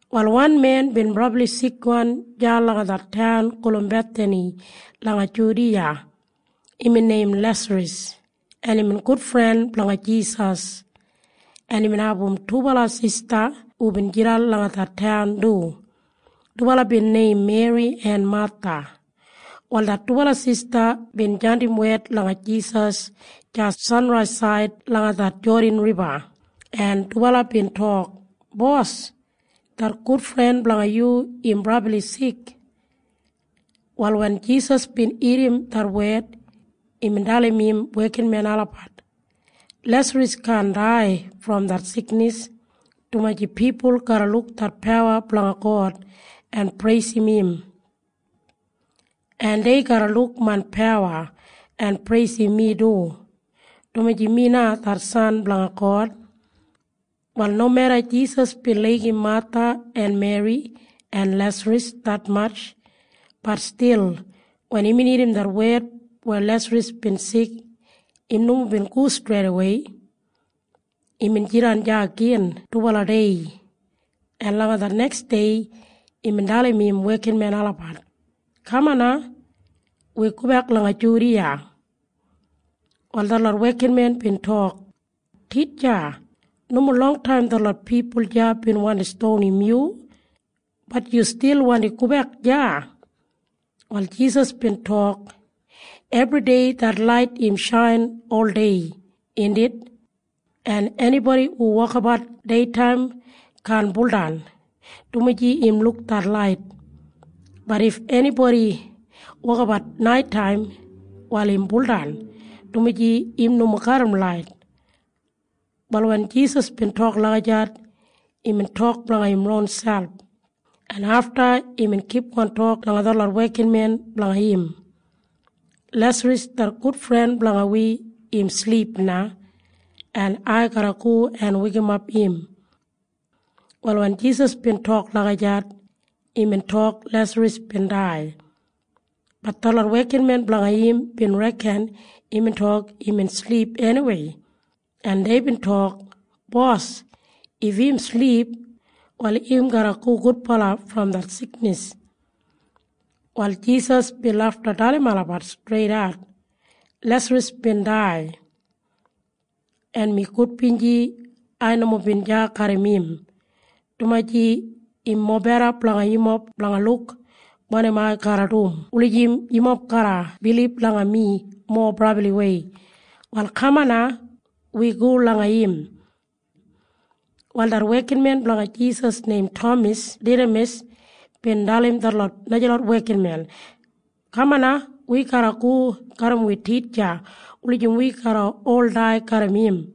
Wal wan men bin brabli sikwan deya langa det taun gulum Bethani langa Judiya. Imbin neim Lesaras, en imbin gudfren blanga Jisas. En imbin abum dubala sista hubin jidan langa det taun du. Dubala bin neim Meri en Matha. Wal det dubala sista bin jandim wed langa Jisas deya sanraisaid langa det Jodan Riba, en dubala bin tok, “Bos, det gudfren blanga yu im brabli sik.” Wal wen Jisas bin irrim det wed, imbin dalim im wekinmen olabat, “Lesaras kaan dai brom det siknis, dumaji pipul garra luk det pawa blanga God en preisim im. En dei garra luk main pawa en preisim mi du, dumaji mi na det San blanga God.” Wal nomeda Jisas bin laigim Matha en Meri en Lesaras detmatj, bat stil wen imbin irrim det wed weya Lesaras bin sik, im nomo bin go streidawei. Imbin jidan deya gin dubala dei, en langa det neksdei imbin dalim im wekinmen olabat, “Kaman na. Wi gobek langa Judiya.” Wal detlot wekinmen bin tok, “Titja, nomo longtaim detlot pipul deya bin wandi stonim yu. Bat yu stil wandi gobek deya?” Wal Jisas bin tok, “Ebridei det lait im shain oldei, indit? En enibodi hu wokabat deitaim kaan buldan, dumaji im luk det lait. Bat if enibodi wokabat naitaim, wal im buldan, dumaji im nomo garram lait.” Wal wen Jisas bin tok lagijat, imbin tok blanga im ronselp, en afta imbin kipgon tok langa detlot wekinmen blanga im, “Lesaras det gudfren blanga wi im silip na. En ai garra go en weikimap im.” Wal wen Jisas bin tok lagijat, imbin tok Lesaras bin dai. Bat detlot wekinmen blanga im bin reken imbin tok imbin silip eniwei, en deibin tok, “Bos, if im silip, wal im garra go gudbala brom det siknis.” Wal Jisas bin lafta dalim olabat streidat, “Lesaras bin dai. En mi gudbinji ai nomo bin deya garram im, dumaji im mobeda blanga yumob blanga luk wanim ai garra dum wulijim yumob garra bilib langa mi mowa brabliwei. Wal kaman na. Wi go langa im.” Wal det wekinmen blanga Jisas neim Tamas Didamas bin dalim detlot najalot wekinmen, “Kaman na. Wi garra go garram wi titja wulijim wi garra ol dai garram im.”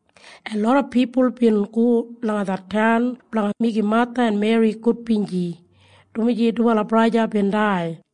en loda pipul bin go langa det taun blanga meigim Matha en Meri gudbinji, dumaji dubala braja bin dai.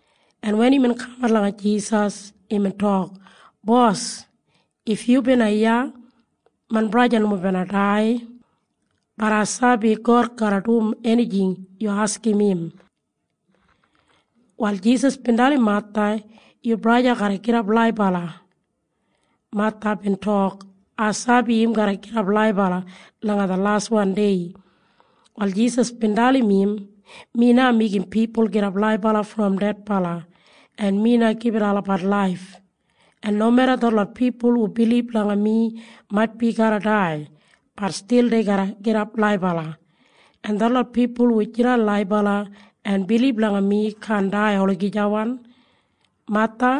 en wen imbin kamat langa Jisas, imbin tok, “Bos, if yu bina iya, main braja nomo bina dai. Bat ai sabi God garra dum enijing yu askim im.” Wal Jisas bin dalim Matha, “Yu braja garra gidap laibala.” Matha bin tok, “Ai sabi im garra gidap laibala langa det laswan dei.” Wal Jisas bin dalim im, “Mi na meigim pipul gidap laibala brom dedbala. En mi na gibit olabat laif. En nomeda detlot pipul hu bilib langa mi maitbi garra dai, bat stil dei garra gidap laibala. En detlot pipul hu jidan laibala en bilib langa mi kaan dai olagijawan. Matha,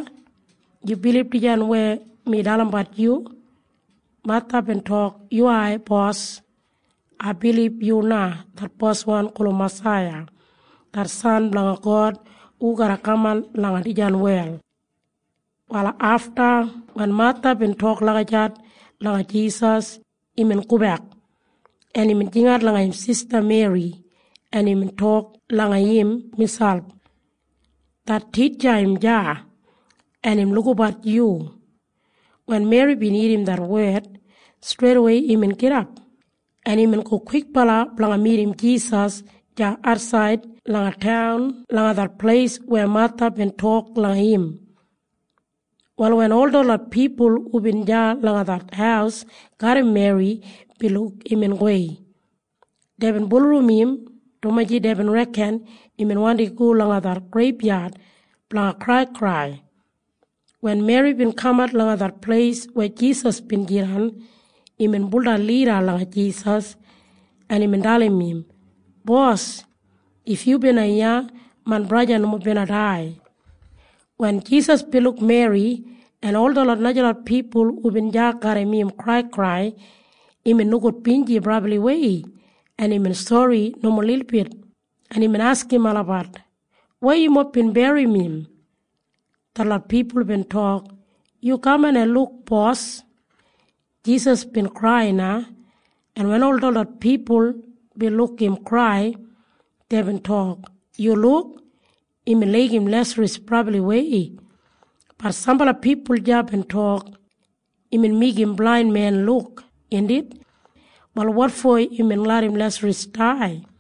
yu bilib dijan weya mi dalimbat yu?” Matha bin tok, “Yuwai, Bos. Ai bilib yu na det Boswan gulum Masaiya det San blanga God hu garra kaman langa dijan wel.” Wal afta wen Matha bin tok lagijat langa Jisas, imbin gobek, en imbin jingat langa im sista Meri, en imbin tok langa im miselp, “Det titja im deya, en im lukabat yu.” Wen Meri bin irrim det wed, streidawei imbin gidap, en imbin go kwikbala blanga midim Jisas deya atsaid langa taun langa det pleis weya Matha bin tok langa im. Wal wen ol detlot pipul hubin deya langa det haus garram Meri bin luk imbin gowei, deibin bulurrum im, dumaji deibin reken imbin wandi go langa det greibyad blanga kraikrai. Wen Meri bin kamat langa det pleis weya Jisas bin jidan, imbin buldan lida langa Jisas, en imbin dalim im, “Bos, if yu bina iya, main braja nomo bina dai.” Wen Jisas bin luk Meri en ol detlot najalot pipul hubin deya garram im kraikrai, imbin nogudbinji brabliwei, en imbin sori nomo lilbit, en imbin askim olabat, “Weya yumob bin berrim im?” Detlot pipul bin tok, “Yu kaman en luk, Bos.” Jisas bin krai na, en wen ol detlot pipul bin luk im krai, deibin tok, “Yu luk. Imbin laigim Lesaras brabliwei.” Bat sambala pipul deya bin tok, “Imbin meigim blain men luk, indit? Wal wotfo imbin larram Lesaras dai?”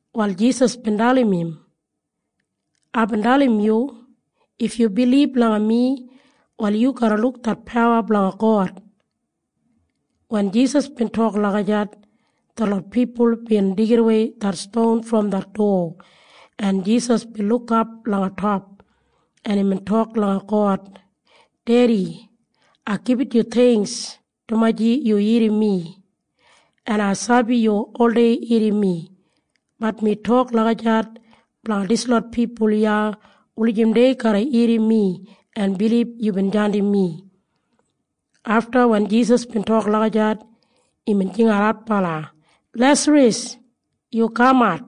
Wal Jisas bin dalim im, “Aibin dalim yu, if yu bilib langa mi, wal yu garra luk det pawa blanga God.” Wen Jisas bin tok lagijat, detlot pipul bin deigidawei det ston brom det dowa, en Jisas bin lukap langa top, en imbin tok langa God, “Dedi, ai gibit yu theingks, dumaji yu irrim mi. En ai sabi yu oldei irrim mi. Bat mi tok lagijat blanga dislot pipul iya wulijim dei garra irrim mi en bilib yubin jandim mi.” Afta wen Jisas bin tok lagijat, imbin jingat adbala, “Lesaras! Yu kamat!”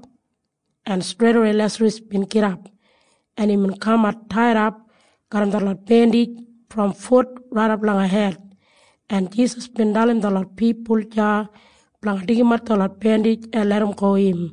En streidawei Lesaras bin gidap, en imbin kamat taidap garram detlot bendij brom fut raidap langa hed. En Jisas bin dalim detlot pipul deya blanga deigimat detlot bendij en larramgo im.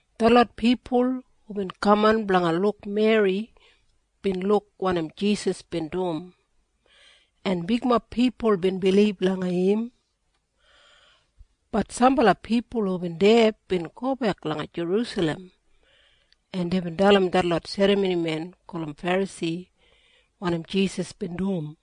Detlot pipul hubin kaman blanga luk Meri bin luk wanim Jisas bin dum, en bigmob pipul bin bilib langa im. Bat sambala pipul hubin deya bin gobek langa Jerusalem, en deibin dalim detlot serramonimen gulum Ferasi wanim Jisas bin dum,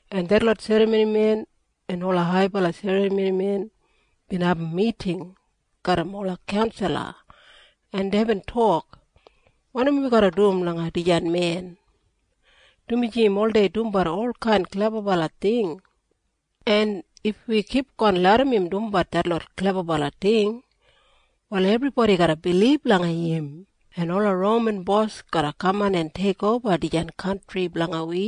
en detlot serramonimen en ola haibala serramonimen bin abum miting garram ola kaunsala, en deibin tok, “Wanim wi garra dum langa dijan men? Dumaji im oldei dumbat olkain klebabala ting. En if wi kipgon larram im dumbat detlot klebabala ting, wal ebribodi garra bilib langa im, en ola Roman bos garra kaman en teikoba dijan kantri blanga wi,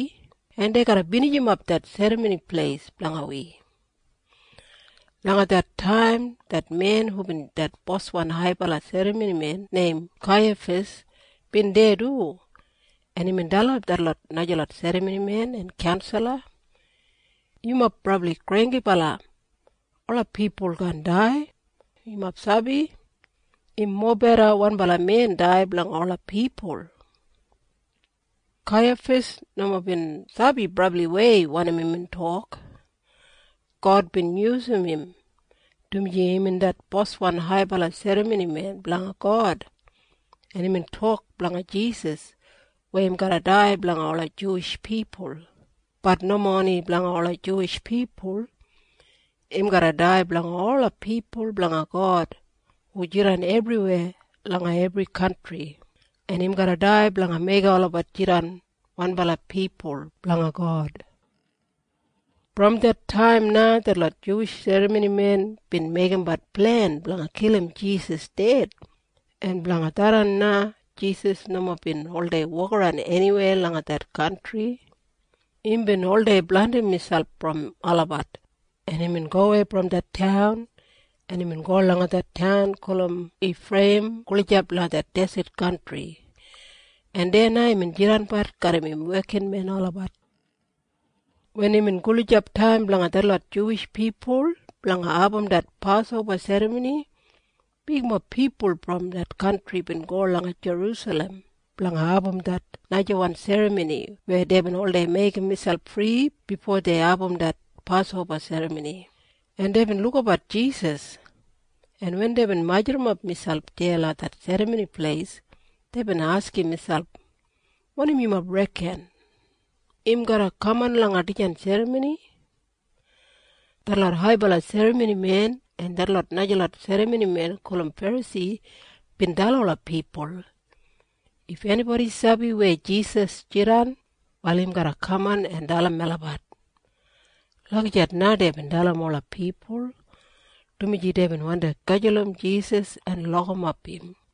en dei garra binijimap det Serramoni Pleis blanga wi.” Langa det taim det men hubin det boswan haibala serramonimen neim Kaiyafas bin deya du, en imbin dalim detlot najalot serramonimen en kaunsala, “Yumob brabli granggibala. Ola pipul kaan dai. Yumob sabi? Im mobeda wanbala men dai blanga ola pipul.” Kaiyafas nomo bin sabi brabliwei wanim imbin tok. God bin yusum im, dumaji imbin det boswan haibala serramonimen blanga God, en imbin tok blanga Jisas weya im garra dai blanga ola Juwish pipul. Bat nomo oni blanga ola Juwish pipul. Im garra dai blanga ola pipul blanga God hu jidan ebriweya langa ebri kantri, en im garra dai blanga meigim olabat jidan wanbala pipul blanga God. Brom det taim na detlot Juwish serramonimen bin meigimbat plen blanga kilim Jisas ded, en blanga tharran na Jisas nomo bin oldei wokaran eniwei langa det kantri. Imbin oldei blandim miselp brom olabat, en imbin gowei brom det taun, en imbin go langa det taun gulum Ifreiyim gulijap langa det deset kantri, en deya na imbin jidanbat garram im wekinmen olabat. Wen imbin gulijap taim blanga detlot Juwish pipul blanga abum det Pasoba Serramoni, bigmob pipul brom det kantri bin go langa Jerusalem blanga abum det najawan serramoni weya deibin oldei meigim miselp fri bifo dei abum det Pasoba Serramoni, en deibin lukabat Jisas, en wen deibin majurrumap miselp deya langa det Serramoni Pleis, deibin askim miselp, “Wanim yumob reken? Im garra kaman langa dijan serramoni?” Detlot haibala serramonimen en detlot najalot serramonimen gulum Ferasi bin dalim ola pipul, “If enibodi sabi weya Jisas jidan, wal im garra kaman en dalim melabat.” Lagijat na deibin dalim ola pipul, dumaji deibin wandi gajulum Jisas en lokimap im.